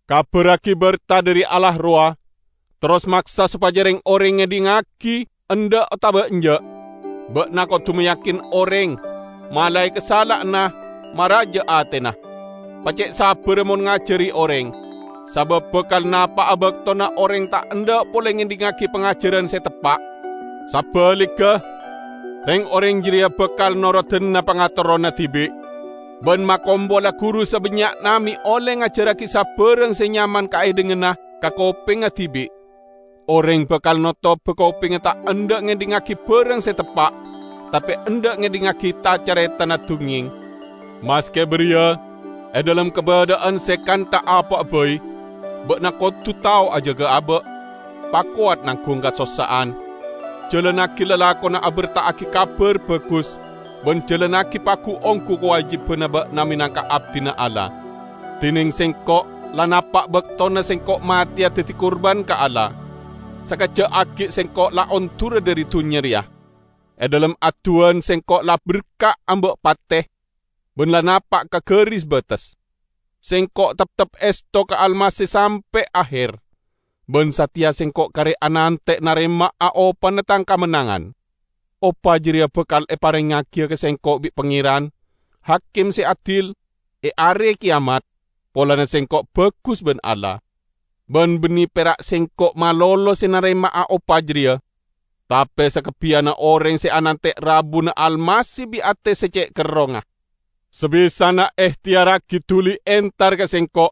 Kabarragi berta dhari Allah rowa, terros maksa sopaja reng-oreng ngedhingngagi, endha' otaba enja'. Ba'na kodu mayakin oreng, malae kasala'anna, maraja atena. Pace'sabbarra mon ngajari oreng. Sabab bakal napa'a baktona oreng ta' endha' pole ngedhingngagi pangajaran se teppa'. Sabaligga, reng-oreng jareya bakal norodana pangaterrona dibi', ban makompola guru sabannya'na me' olle ngajarragi sabarang se nyaman kaedhinganna ka kopengnga dibi'. Oreng bakal notoba kopengnga ta' endha' ngedhingngagi barang se teppa', tape endha' ngedhingngagi ta-caretana dungngeng. Maske bariya, e dhalem kabadha'an se kantha apa'a bai, ba'na kodu tao ajaga aba'. Pakowat nanggung kasossa'an, jalannagi lalakonna aberta'agi Kabar Bagus, ban jalannagi pagu-onggu kawajibanna ba'na menangka abdina Allah. Dineng sengko', la napa' baktona sengko' mateya daddi kurban ka Allah. Sakejja' aggi' sengko' la ondura dhari dunnya reya. E dhalem adduwan sengko' la berka' amba' pate, ban la napa' ka garis bates. Sengko' teptep esto ka Almasih sampe' aher. Ban sateya sengko' kare anante' narema'a opana tang kamennangan. Opa jareya bakal eparengngagiya ka sengko' bi' Pangeran, Hakim se adil, e Are Keyamat, polana sengko' bagus ban Allah. Ban banne pera' sengko' malolo se narema'a opa jareya, tape sakabbiyanna oreng se anante' rabuna Almasih bi' ate se ce' kerrongnga. Sabisana ehteyarragi duli entar ka sengko',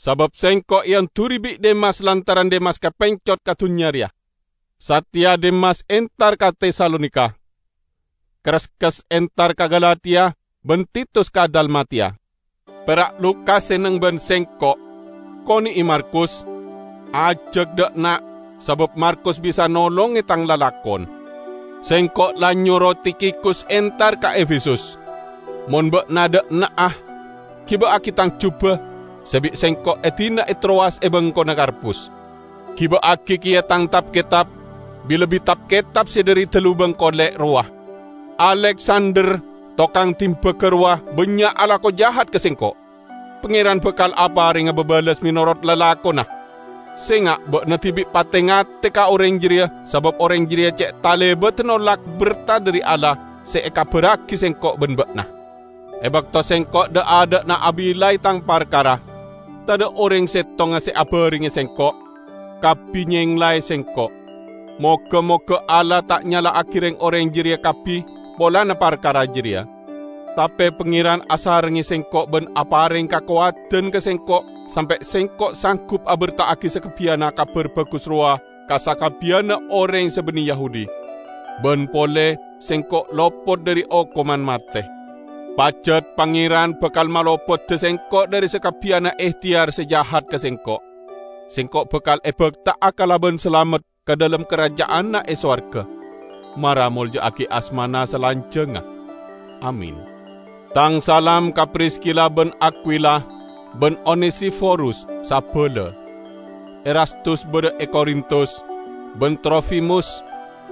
sabab sengko' eonduri bi' Demas lantaran Demas kapencot ka dunnya reya. Sateya Demas entar ka Tesalonika. Kreskes entar ka Galatia, ban Titus ka Dalmatiya. Pera' Lukas se neng ban sengko'. Kone'e Markus, ajak dha' enna', sabab Markus bisa nolonge tang lalakon. Sengko' la nyoro Tikhikus entar ka Efesus. Mon ba'na dha' enna'a, giba'agi tang juba se bi' sengko' edina e Trowas e bengkona Karpus. Giba'agi keya tang tab-ketab, bi-lebbi tab-ketab se dhari dalubang kole' rowa. Aleksander, tokang dimbaga rowa bannya' alako jahat ka sengko'. Pangeran bakal aparenga babales menorot lalakonna. Senga' ba'na dibi' pate-ngate ka oreng jareya sabab oreng jareya ce' talebadda nolak berta dhari Allah se ekabarragi sengko' ban ba'na. E bakto sengko' dha'-adha'na abillai tang parkara, tadha' oreng settonga se abarengnge sengko'; kabbi nyenglae sengko'. Moga-moga Allah ta' nyala'agi reng-oreng jareya kabbi polana parkara jareya. Tape Pangeran asarengnge sengko' ban apareng kakowadan ka sengko' sampe' sengko' sanggup aberta'agi sakabbiyanna Kabar Bagus rowa ka sakabbiyanna oreng se banne Yahudi. Ban pole sengko' lopot dhari okoman mate. Pajat Pangeran bakal malopoda sengko' dhari sakabbiyanna ehteyar se jahat ka sengko'. Sengko' bakal ebakta'a kalaban salamet ka dhalem karaja'anna e sowarga. Mara molja'agi asmana salanjangnga! Amin. Tang salam ka Priskila ban Akwila ban Onesiforus sabala. Erastus badha e Korintus, ban Trofimus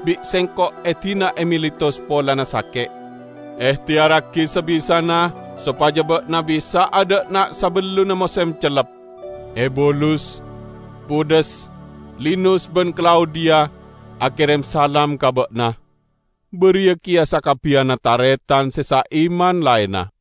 bi' sengko' edina e Miletus polana sake'. Ehteyarragi sabisana sopaja ba'na bisa'a dha'enna' sabellunna mosem cellep. Ebulus, Pudes, Linus ban Klaudiya akerem salam ka ba'na; bariya keya sakabbiyanna taretan se saiman laenna.